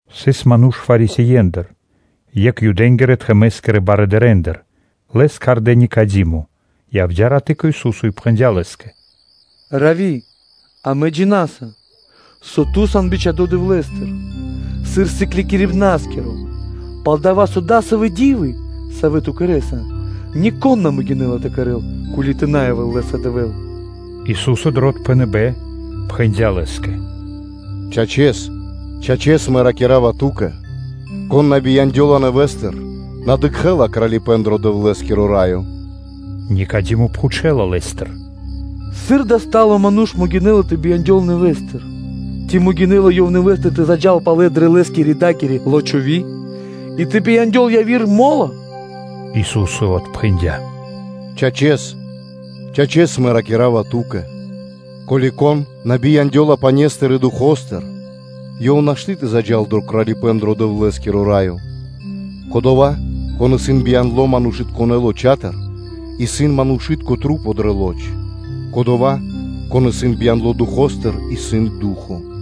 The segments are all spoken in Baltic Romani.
Сыс ману́ш Фарисеендыр, екх Юдэ́нгирэ-тхэмэ́скирэ барыдырэндыр, лэс кхардэ́ Никадимо, саво́ явдя́ раты́ кэ Ису́со и пхэндя́ Лэ́скэ: “Равви! Амэ джина́са, со Ту сан бичхадо́ Дэвлэ́стыр сыр Сыклякирибна́скиро, пал-дова́ со дасавэ́ ди́вы, савэ́ Ту кэрэ́са, нико́н на могинэ́ла тэ кэрэ́л, ко́ли тэ на явэ́л лэ́са Дэвэ́л.” Ису́со дро отпхэныбэ́н пхэндя́ лэ́скэ: “Чачэс, чачэс Мэ ракира́ва ту́кэ: кон на бияндёла нэвэ́стыр, на дыкхэ́ла Кралипэ́н дро Дэвлэ́скиро Раё.” Никадимо пхучэла Лэ́стыр: “Сыр дава́ баро́ (стало) ману́ш могинэ́ла тэ бияндёл нэвэ́стыр? Ци могинэ́ла Ёв нэвэ́стыр тэ заджа́л палэ дрэ лэ́скирэ-дакири лочови́ (утроба) и тэ бияндёл яви́р мо́ло?” Ису́со отпхэндя́: “Чачэс, чачэс, Мэ ракира́ва ту́кэ: ко́ли кон на бияндёла пане́стыр и Духо́стыр (Фаностыр), ёв нашты́ тэ заджа́л дро Кралипэ́н дро Дэвлэ́скиро Раё. Кодова́, со исын бияндло манушытконэ́ лочатыр, исын манушы́тка маса́ дрэ лоч; кодова́, со исын бияндло Духо́стыр, исын ду́хо (фа́но).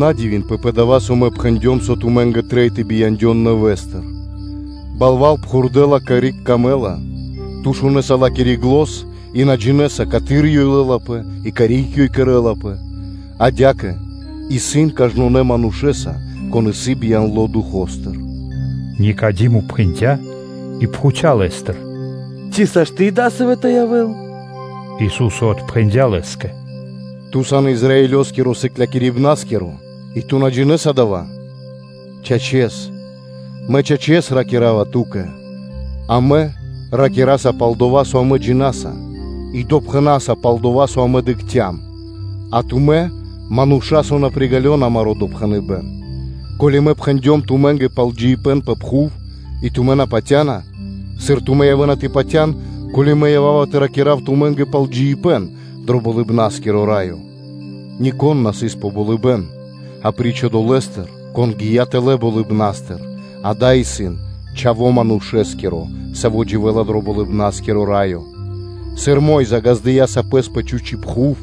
На дивинэнпэ пэ дава́, со Мэ пхэндём, со тумэ́нгэ трэй тэ бияндён нэвэ́стыр. Ду́хо (Фа́но) пхурдэла, карик трэй лэ́скэ. Ту шунэса ла́кири зан, и на джинэ́са, каты́р ёй лэ́лапэ и карик ёй кэрлапэ. Адя́кэ исын кажнонэ́ манушэ́са, кон исын бияндло Духо́стыр.” Никадимо пхэндя́ и пхуця́ Лэ́стыр: “Ци сашты́ (можна) дасаво тэ явэ́л?” Ису́со отпхэндя́ лэ́скэ: “Ту сан Израилёскиро Сыклякирибна́скиро и ту на джинэ́са дава́? Чачэс, Мэ чачэс ракира́ва ту́кэ: амэ ракираса пал дова́, со амэ джина́са, и допхэнаса пал дова́, со амэ дыкхцям; а тумэ́ мануша́, со на приґалёна амаро́ допхэныбэ́н. Ко́ли Мэ пхэндём тумэ́нгэ пал джиибэ́н пэ пхув, и тумэ́ на патя́на, сыр тумэ́ явэ́на тэ патя́н, ко́ли Мэ ява́ва тэ ракира́в тумэ́нгэ пал джиибэ́н дро Болыбна́скиро Раё? Нико́н на сыс пэ болыбэ́н апри́ч Одолэ́стэ, кон гия́ тэлэ́ болыбна́стыр, дава́ исын Чхаво́ Манушэ́скиро, Саво́ дживэ́ла дро Болыбна́скиро Раё. Сыр Мо́йза (Моисеё) ґаздыя́ сапэс пэ чхучи́ пхув,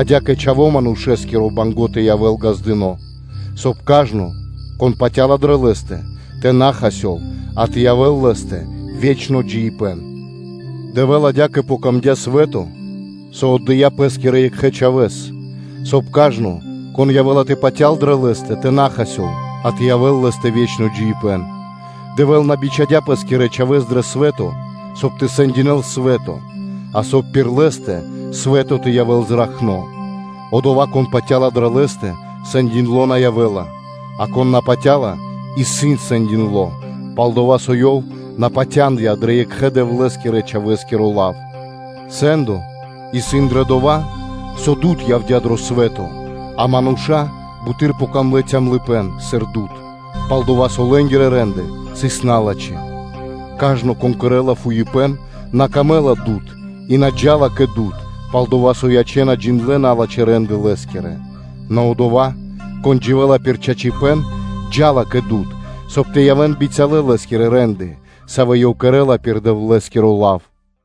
адя́кэ Чхавэ́скэ Манушэскирэскэ трэиндя́ тэ явэ́л ґаздыно́, соб (кай) кажно, кон патя́ла дрэ Лэ́стэ, тэ на хасёл, а тэ явэ́л лэ́стэ ве́чно джиибэ́н. Дэвлэ́скэ адя́кэ яця́ дро́го свэ́то, со Ёв отдыя́ Пэ́скирэ Екхэбияныпнытконэ Чхавэ́с, соб (кай) кажно, кон явэ́ла тэ патял дрэ Лэ́стэ, тэ на хасёл, а тэ явэ́л лэ́стэ ве́чно джиибэ́н. Дэвэ́л на бичхадя́ Пэ́скирэ Чхавэ́с дро свэ́то, соб (кай) тэ сэндякирэ́л свэ́то, а соб (кай) пир Лэ́стэ свэ́то тэ явэ́л зракхно. Одова́, кон патя́ла дрэ Лэ́стэ, сэндякирдо на явэ́ла, а кон на патя́ла, исын сэндякирдо, пал-дова́ со ёв на патяндыя дрэ Екхэбияныпнытконэ Дэвлэ́скирэ-Чхавэ́скиро лав. Сэ́ндо исын дрэ дова́, со дуд явдя́ дро свэ́то, а манушэ́нгэ буты́р пир ило́ яця́ калыпэ́н (цёмныма), сыр дуд, пал-дова́ со лэ́нгирэ рэ́нды (де́лы) сыс налачхэ́. Кажно, кон кэрэ́ла фуипэ́н, лэ́скэ исын на пир ило́ дуд (свэ́то), и ёв на джа́ла кэ дуд, пал-дова́, соб (кай) тэ ячэн джиндлэ́ налачхэ́ рэ́нды лэ́скирэ. Нэ одова́, кон дживэ́ла пир чачипэ́н, джа́ла кэ дуд, соб (кай) тэ явэ́н бицялэ лэ́скирэ рэ́нды, савэ́ ёв кэрэ́ла пир Дэвлэ́скиро лав.”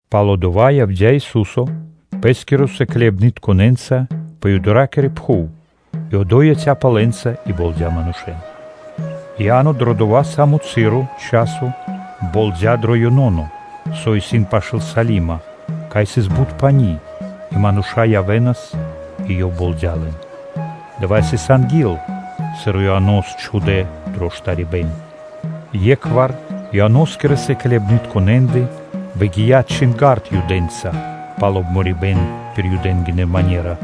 Пало́ дава́ явдя́ Ису́со Пэ́скирэ сыкляибнытконэ́нца пэ Юдэякири пхув и одо́й яця́пэ лэ́нца и болдя манушэ́н. Иа́но дрэ дова́-са́мо часо болдя дро Еноно, со исын пашы́л Салимо, кай сыс бут пани́, и мануша́ явэ́нас и ёв болдя лэн. Дава́ сыс анги́л, сыр Ианос чхудэ́ дро штарибэ́н. Екхвар Ианоскирэ сыклытконэндэ выгия́ чинга́рд Юдэнца пал обморибэн пир Юды́тко манера.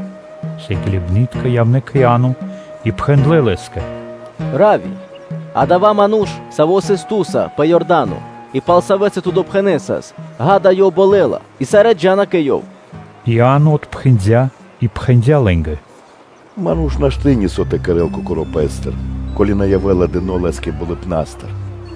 Сыкляибны́тка явнэ́ кэ Иа́но и пхэндлэ́ лэ́скэ: “Равви! Одова́ ману́ш, Саво́ сыс ту́са пэ Иорда́но и пал Савэ́стэ ту допхэнэсас, ґа́да, Ёв болэла, и сарэ́ джа́на кэ ёв.” Иа́но отпхэндя́ и пхэндя́ лэ́нгэ: “Ману́ш нашты́ нисо́ тэ кэрэ́л кокоро́ пэ́стыр, ко́ли на явэ́ла дыно́ лэ́скэ болыбна́стыр.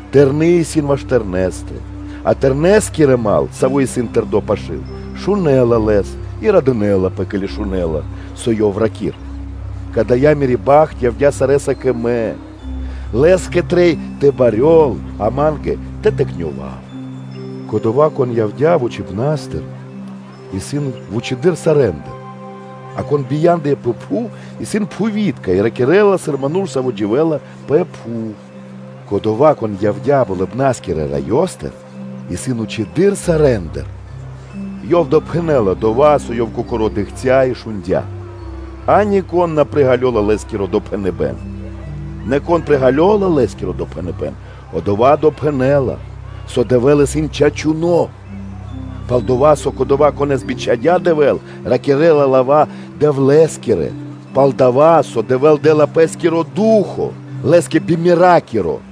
Тэрны́ исын ваш Тэрнэскэ, а Тэрнэскиро дру́го (мал), саво́ исын тэрдо́ пашы́л, шунэ́ла лэс и радынэ́лапэ, ке́ли шунэ́ла, со ёв ракирэ́ла. Кадая́ мири́ бахт явдя́ сарэ́са кэ мэ. Лэ́скэ трэй тэ барьёл, а ма́нгэ тэ тыкнёвав. Кодова́, Кон явдя́ вучипна́стыр, исын вучэды́р сарэ́ндыр; а кон бия́ндыя пэ пхув исын пхувитко, и ракирэ́ла сыр ману́ш, саво́ дживэ́ла пэ пхув. Кодова́, Кон явдя́ Болыбна́скирэ Раёстыр, исын вучэды́р сарэ́ндыр. Ёв допхэнэ́ла дова́, со Ёв кокоро́ дыкхця́ и шундя́, а нико́н на приґалёла Лэ́скиро допхэныбэ́н. Нэ кон приґалёла Лэ́скиро допхэныбэ́н, одова́ допхэнэ́ла, со Дэвэ́л исын чачуно́. Пал-дова́ со Кодова́, Конэ́с бичхадя́ Дэвэ́л, ракирэ́ла лава́ Дэвлэ́скирэ, пал-дова́ со Дэвэ́л дэ́ла Пэ́скиро Ду́хо (Фа́но) Лэ́скэ би меракиро.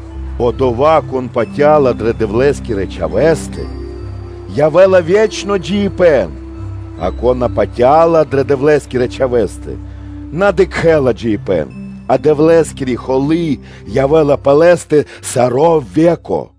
Одова́, кон патя́ла дрэ Дэвлэ́скирэ Чхавэ́стэ, лэ́стэ явэ́ла ве́чно джиибэ́н; а кон на патя́ла дрэ Дэвлэ́скирэ Чхавэ́стэ, одова́ на дыкхэ́ла джиибэ́н, а Дэвлэ́скири холы́ явэ́ла пэ лэ́стэ саро́ ве́ко.”